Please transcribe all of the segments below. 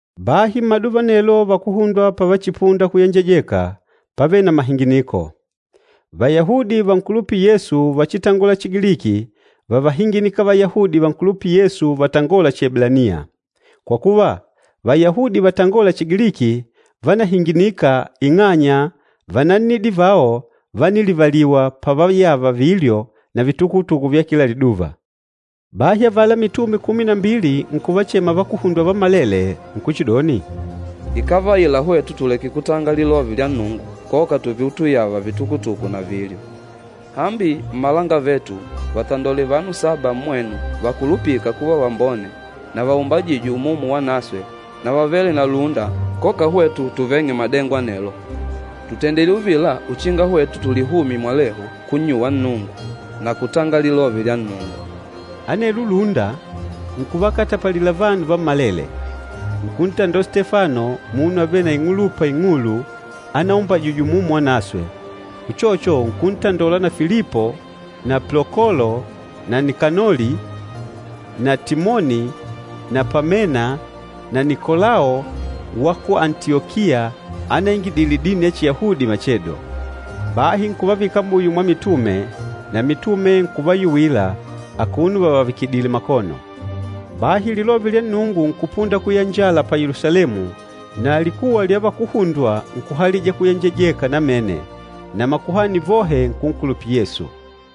Bahi mmaduva anelo vakuhundwa pavachipunda kuyenjejeka, pávele na mahinginiko. Vayahudi vankulupîla Yesu vachitangola Chigiliki vávahinginika Vayahudi vankulupîla Yesu vatangôla Chieblaniya. Kwa kuva, Vayahudi vatangôla Chigiliki vánahinginika ing'anya vanannidi vao vánilivaliwa pavayava vilyo na vitukutuku vya kila liduva. Bahi avala mitume kumi na mbili nkuvachema vakuhundwa vammalele nkuchidoni, “Ikávaila hwetu tuleke kutanga lilove lya Nnungu koka tuve utuyava vitukutuku na vilyo. Hambi mmalangavetu, vatandole vanu saba mmwenu vakulupîka kuva vambone na vaumbajîjwe Umumu Wanaswe na vavêle na lúnda koka hwetu tuveng'e madengo anelo. Tùtendile uvila uchinga hwetu tulihumye mwalehu kunnyuwa Nnungu na kutanga Lilove lya Nnungu.” Anelwo lúnda nkuvakatapalila vanu vammalele. Nkuntandola Stefano munu avêle na ing'ulupa ing'ulu anaumbajijwe Umumu Wanaswe, uchocho nkuntandola na Filipo na Plokolo na Nikanoli na Timoni na Pamena na Nikolao wa ku Antiyokiya anaingidile dini ya Chiyahudi machedo. Bahi nkuvavika muyo mwa mitume, na mitume nkuvayuwila akuno vavavikidile makono. Bahi Lilove lya Nnungu nkupunda kuyanjala pa Yelusalemu na likuwa lya vakuhundwa nkuhalija kuyenjejeka namene, na makuhani vohe nkunkulupila Yesu.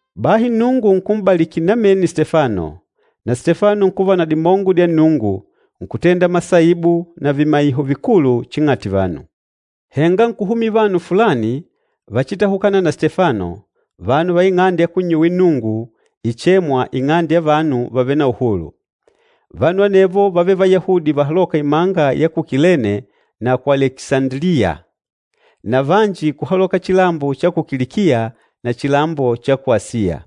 Bahi Nnungu nkum'baliki namene Stefano, na Stefano nkuva na dimongo dya Nnungu, nkutenda masaibu na vimaiho vikulu ching'ati vanu. Henga nkuhumila vanu fulani vachitahukana na Stefano, vanu va ing'ande ya kunnyuwila Nnungu ichêmwa, “Ing'ande ya vanu vavêle na uhulu.” Vanu anevo vávele Vayahudi vahalôka imanga ya ku Kilene na ku Alekisandiliya na vanji kuhaloka chilambo cha ku Kilikiya na chilambo cha ku Asiya.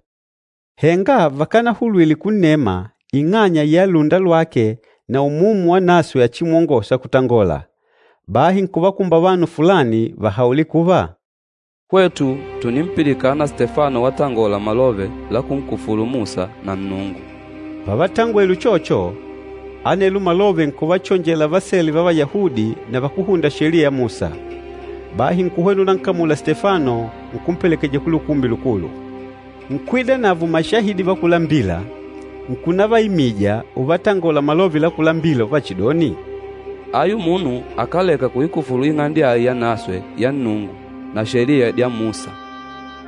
Henga vakanahulwile kunnema ing'anya ya lúnda lwake na Umumu Wanaswe achimwongôsa kutangola. Bahi nkuvakumba vanu fulani vahaule kuva, “Hwetu tùnimpilikana Stefano watangola malove la kunkufulu Musa na Nnungu.” Pavatangwele uchocho, anelo malove nkuvachonjela vasele va Vayahudi na vakúhunda Sheliya ya Musa. Bahi nkuhwena unankamula Stefano nkumpelekeja ku Lukumbi Lukulu. Nkwidanavo mashahidi vakúlambila nkunavaimija uvatangola malove lakúlambila uvachidoni, “Ayu munu akáleka kuikufulu Ing'ande ai yanaswe ya Nnungu na Sheliya dya Musa.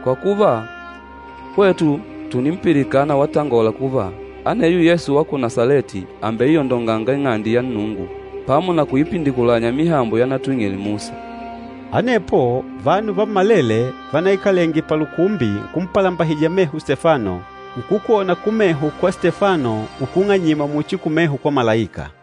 Kwa kuva, hwetu tùnimpilikana watangola kuva, aneyo Yesu wa ku Nasaleti àmbeiyondonganga Ing'ande ya Nnungu pamo na kuipindikulanya mihambo yanatwing'ile Musa.” Anepo, vanu vammalele vanaikalenge palukumbi nkumpalambahija meho Stefano, nkukwona kumeho kwa Stefano ukung'anyima muchi kumeho kwa malaika.